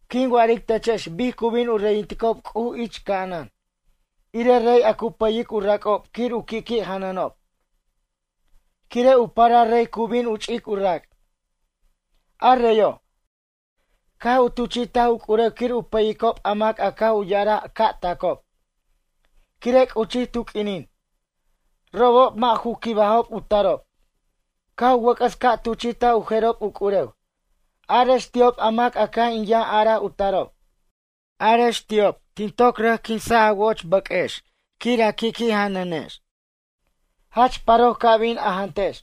―Quin wa'aric techex bic cu bin u reyinticob C'uj ich ca'anan, irej rey a cu pʌyic u rac'ob quir u qui'qui' janʌnob. Quire' u parar rey cu bin u ch'ic u rac'. A reyo', caj u tuchi'taj u c'urew quir u pʌyicob a mac a caj u ya'araj ca' tacob, quire' c'uchij tu q'uinin. Robob mʌ' ju quibajob u tarob. Caj u wʌc'ʌs ca' tuchi'taj u jerob u c'urew: “Arex ti'ob a mac caj in yʌn araj u tarob. Arex ti'ob tin toc rʌc quinsaj a wo'och bʌq'uex quir a qui' janʌnex. Jach paroc ca bin a jantex.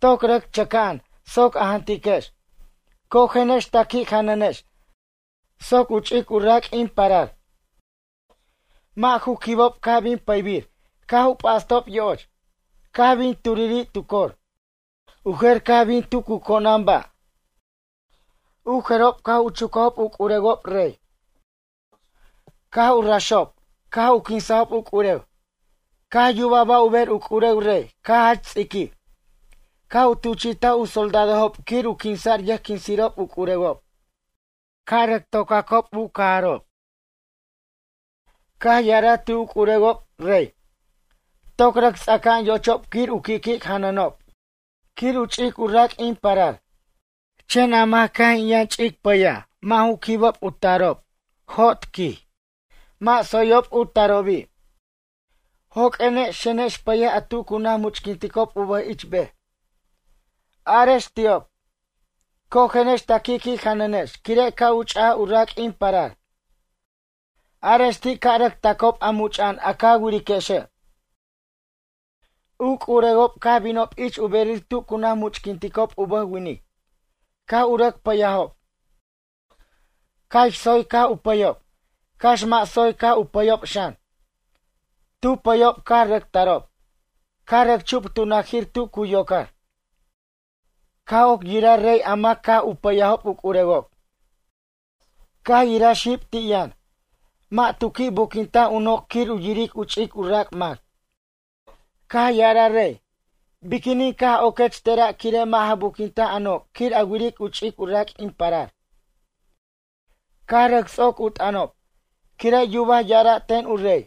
Toc rʌc chʌca'an soc a jantiquex. Cojenex ta qui' janʌnex soc u ch'ic u rac' in parar.” Mʌ' ju quibob caj bin pʌybir caj u p'astob yo'och. Caj bin turiri' tu cor. U jer caj bin tu cu conan ba'. U jerob caj u chucajob u c'urewob rey, caj u raxob caj u quinsajob u c'urew. Caj yuba ba' u ber u c'urew rey caj jach ts'iquij. Caj u tuchi'taj u soldadojob quir u quinsa'r yʌjquinsirob u c'urewob, ca' u rʌc to'cacob u cajarob. Caj ya'araj ti' u c'urewob, rey: “Toc rʌc ts'aca'an yo'ochob quir u qui'qui' janʌnob quir u ch'ic u rac' in parar. Chen a mac caj in yʌn ch'ic pʌyaj mʌ' ju quibob u tarob jot, quij. Mʌ' tsoyob u tarobi'. Joq'uenex xenex pʌyex a tu cu naj much'quinticob u bʌj ich bej. Arex ti'ob. Cojenex ta qui'qui' janʌnex quire' ca' u ch'aj u rac' in parar. Arex ti' ca' rʌc tacob a much'a'an a ca wiriquexe'.” U c'urewob caj binob ich u berir tu cu naj much'quinticob u bʌj winic. Caj u rʌc pʌyajob, cax tsoy caj u pʌyob, cax mʌ' tsoy caj u pʌyob xan. Tu pʌyob caj rʌc tarob, caj rʌc chup tu najir tu cu yocar. ’Caj oc yiraj rey a mac caj u pʌyob u c'urewob. Caj yiraj xib ti' yʌn. Mʌ' tu qui' buquintaj u noc' quir yiric u ch'ic u rac' mac. Caj ya'araj rey: “Biquinin caj oquech tera' quire' mʌ' ja buquintaj a noc' quir a wiric u ch'ic u rac' in parar?” Caj rʌc ts'oc u t'ʌnob, quire' yubaj ya'ara' ten u rey.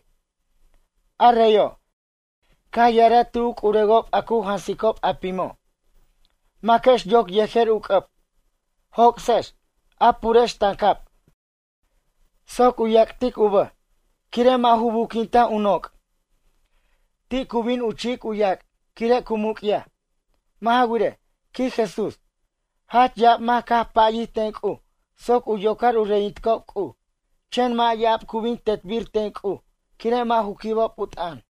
A reyo', caj ya'araj ti' u c'urewob a cu jansicob a pimo': “Maquex yoc yejer u c'ʌb. Joc'sex, a purex tancab soc u yac'tic u bʌj. Quire' mʌ' ju buquintaj u noc'. Ti' cu bin u chi'ic u yac' quire' cu muc'yaj.” Mʌ' ja wirej ―quij Jesús―, jach ya'ab mac caj payij ten C'uj soc u yocar u reyinticob C'uj. Chen mʌ' ya'ab cu bin tetbir ten C'uj quire' mʌ' ju quibob u t'ʌn.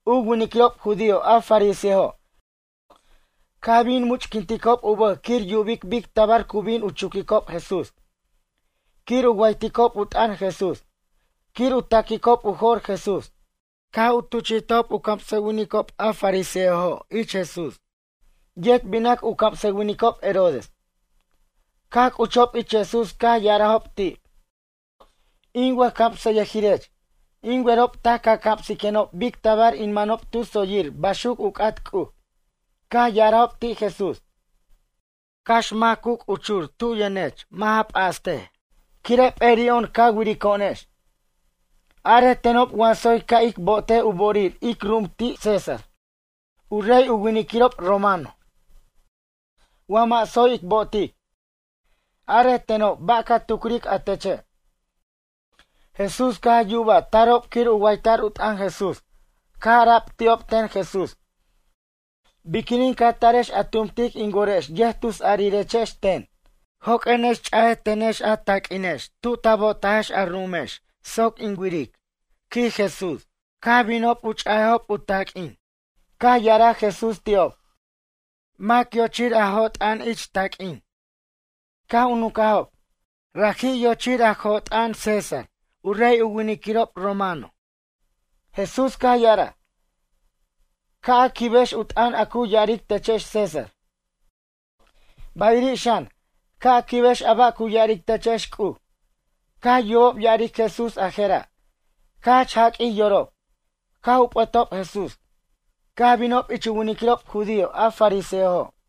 U winiquirob judío a fariseojo' caj bin much'quinticob u bʌj quir yubicob bic tabar cu bin u chuquicob Jesús, quir u wayticob u t'ʌn Jesús, quir u ta'quicob u jo'r Jesús. Caj u tuchi'tajob u camsʌwinicob a fariseojo' ich Jesús, yet binac u camsʌwinicob Herodes. Caj c'uchob ich Jesús caj ya'arajob ti': ―In wʌjcamsʌyʌjirech, in werob taj ca camsiquenob bic tabar in manob tu tsoyir baxuc u c'at C'uj. Caj ya'arajob ti' Jesús: ―Cax mac cu c'uchur tu yʌnech mʌ' ja p'astej, quire' p'eri'o'on ca wirico'onex. Arej tenob wa tsoy ca' ic bo'otej u bo'orir ic ru'um ti' César u rey u winiquirob romano? Wa mʌ' tsoy ic bo'otic? Arej tenob ba' ca tucric a teche'? Jesús caj yubaj tarob quir u wayta'r u t'ʌn Jesús. Caj ara'b ti'ob ten Jesús: ―Biquinin ca tarex a tumtic in worex yʌjtusarirechex ten. Joq'uenex ch'a tenex a taq'uinex tu ta bo'otajex a ru'umex soc in wiric ―quij Jesús. Caj binob u ch'ajob taq'uin. Caj ya'araj Jesús ti'ob: ―Mac yochir a jo'ort'ʌn ich taq'uin? Caj u nuncajob: ―Raji' yochir a jo'ort'ʌn César, u rey u winiquirob romano. Jesús caj ya'araj: ―Ca' a quibex u t'ʌn a cu ya'aric techex César. Bayiri' xan, ca' a quibex a ba' cu ya'aric techex C'uj. Caj yubob ya'aric Jesús a jera', caj jach jaq'uij yorob. Caj u p'ʌtob Jesús, caj binob ich u winiquirob judío a fariseojo'.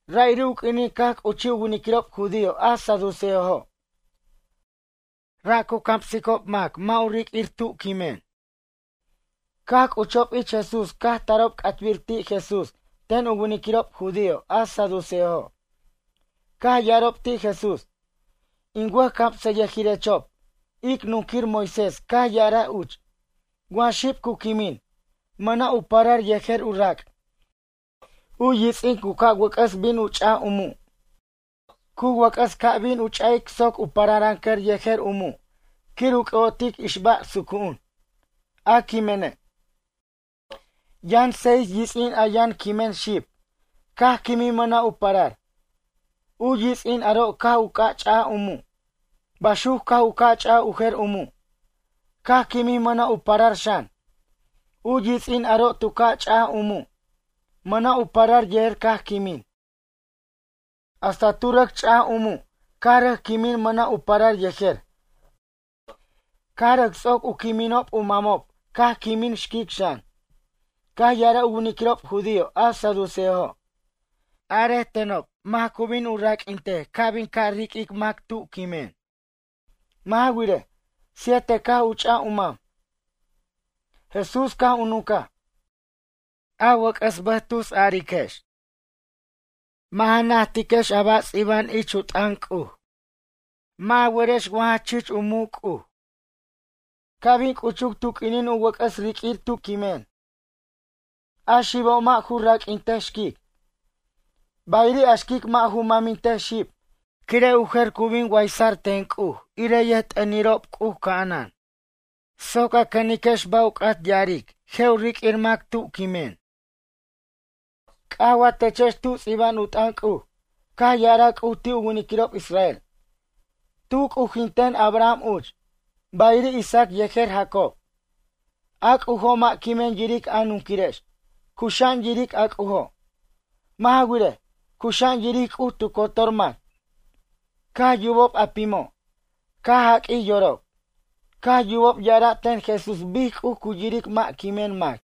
Ra'iri' u q'uinin caj c'uchij u winiquirob judío a saduceojo'. Ra' cu camsicob mac mʌ' u riq'uir ti' quimen. Caj c'uchob ich Jesús caj tarob c'atbir ti' Jesús ten u winiquirob judío a saduceojo'. Caj ya'arob ti' Jesús: ―In wʌjcamsʌyʌjirechob, ic nunquir Moisés caj ya'araj uch. Wa xib cu quimin, mʌna' u parar yejer u rac'. U yits'in cu ca' wʌc'ʌs bin u ch'aj u mu'. Cu wʌc'ʌs ca' bin u ch'a'ic soc u pararancʌr yejer u mu' quir u c'ʌ'otic u ixba' sucu'un, a quimene'. Yʌn seis yits'in a yʌn quimen xib, caj quimij mʌna' u parar. U yits'in aro' caj u ca' ch'aj u mu'. Baxuc caj u ca' ch'aj u jer u mu', caj quimij mʌna' u parar xan. U yits'in aro' tu ca' ch'aj u mu'. Mʌna' u parar yejer caj quimin. Hasta tu rʌc ch'aj u mu' caj rʌc quimin mʌna' u parar yejer. Caj rʌc ts'oc u quiminob u mamob caj quimin xquic xan. Caj ya'araj u winiquirob judío a saduceojo': ―Are tenob mac cu bin raq'uintej ca' bin ca' riq'uir mac tu quimin. Mʌ' ja wirej, siete caj u ch'aj u mam. Jesús caj u nuncaj: ―A wʌc'ʌs bʌj cu tusariquex. Mʌ' ja najtiquex a ba' ts'iba'an ich u t'ʌn C'uj. Mʌ' ja werex wa jach chich u muc' C'uj. Ca' bin c'uchuc tu q'uinin u wʌc'ʌs riq'uir ti' quimen. A xibo' mʌ' ju raq'uintej xquic. Bayiri' a xquic mʌ' ju mʌmintej xib quire' u jer cu bin waysa'r ten C'uj irej yʌjt'ʌnirob C'uj ca'anan. ’Soc a cʌniquex ba' u c'at ya'aric je' u riq'uir mac ti' quimen. C'aj wa techex tu ts'iba'an u t'ʌn C'uj. Caj ya'araj C'uj ti' u winiquirob israel: “Tu c'ujinten Abraham uch. Bayiri' Isaac yejer Jacob.” A C'ujo' mʌ' quimen yiric a nunquirex. Cuxa'an yiric a C'ujo'. Mʌ' ja wirej, cuxa'an yiric C'uj tu cotor mac. Caj yubob a pimo', caj jaq'uij yorob. Caj yubob ya'araj ten Jesús bic C'uj cu yiric mʌ' quimen mac.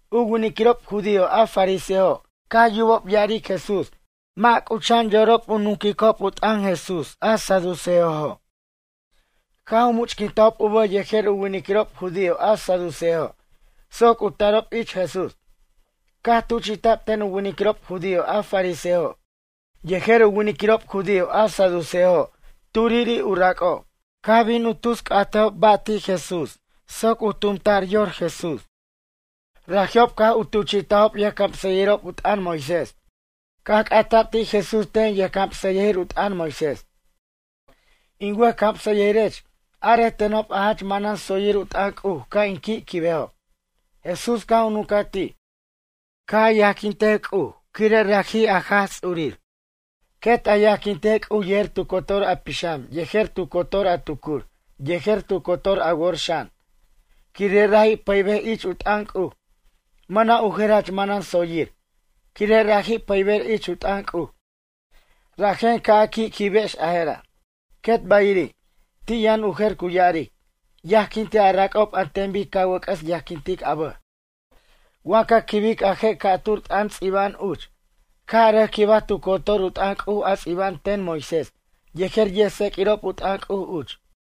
U winiquirob judío a fariseojo' caj yubob ya'aric Jesús mʌ' c'ucha'an yorob u nunquicob u t'ʌn Jesús a saduceojo'. Caj u much'quintajob u bʌj yejer u winiquirob judío a saduceojo' soc u tarob ich Jesús. Caj tuchi'ta'b ten u winiquirob judío a fariseojo' yejer u winiquirob judío a saduceojo' turiri' u rac'ob. Caj bin u tus c'atejob ba' ti' Jesús soc tumta'r yor Jesús. Raji'ob caj u tuchi'tajob yʌjcamsʌyʌjir u t'ʌn Moisés. Caj c'ata'b ti' Jesús ten yʌjcamsʌyʌjir u t'ʌn Moisés: ―In wʌjcamsʌyʌjirech. Arej tenob a jach manan tsoyir u t'ʌn C'uj ca' in qui' quibejob. Jesús caj u nuncaj ti': ―Ca' a yajquintej C'uj, quire' raji' a Jaj Ts'urir. Quet a yajquintej C'uj yejer tu cotor a pixam yejer tu cotor a tucur yejer tu cotor a wor xan, quire' raji' pʌybej ich u t'ʌn C'uj. Mʌna' u jer jach manan tsoyir, quire' raji' pʌyber ich u t'ʌn C'uj. Rajen ca' a qui'quibex a jera'. Quet bayiri', ti' yʌn u jer cu ya'aric: “Yajquintej a rac'ob an ten bic ca wʌc'ʌs yajquintic a bʌj.” Wa ca quibic a je' ca'tur t'ʌn ts'iba'an uch. Caj a rʌc quibaj tu cotor u t'ʌn C'uj a ts'iba'an ten Moisés yejer yʌjtseq'uirob u t'ʌn C'uj uch.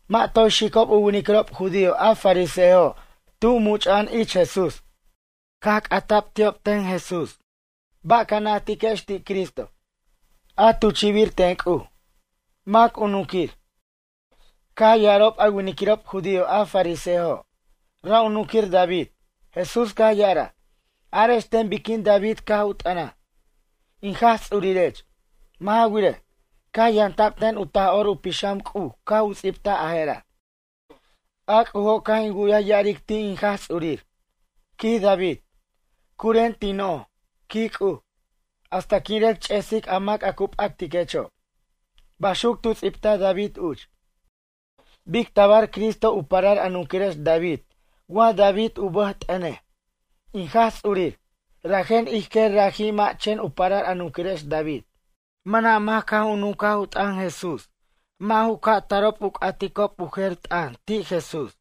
Mʌ' toy xicob u winiquirob judío a fariseojo' tu much'a'an ich Jesús. Caj c'ata'b ti'ob ten Jesús: ―Ba' ca najtiquex ti' Cristo, a tuchi'bir ten C'uj. Mac u nunquir? Caj ya'arob a winiquirob judío a fariseojo': ―Ra' u nunquir David. Jesús caj ya'araj: ―Arex ten biquin David caj u t'ʌnaj: “In Jaj Ts'urirech.” Mʌ' ja wirej, caj yamta'b ten u Taj'or u Pixam C'uj caj u ts'ibtaj a jera': A C'ujo' caj in wu'yaj ya'aric ti' in Jaj Ts'urir, quij David: “Curen tin noj, quij C'uj, hasta quin rʌc ch'esic a mac a cu p'actiquecho'.” Baxuc tu ts'ibtaj David uch. Bic tabar Cristo u parar a nunquirex David wa David u bʌj t'ʌnej: “In Jaj Ts'urir.” Rajen ij quer raji' mʌ' chen u parar a nunquirex David. Mʌna' mac caj u nuncaj u t'ʌn Jesús, mʌ' ju ca' tarob u c'aticob u jer t'ʌn ti' Jesús.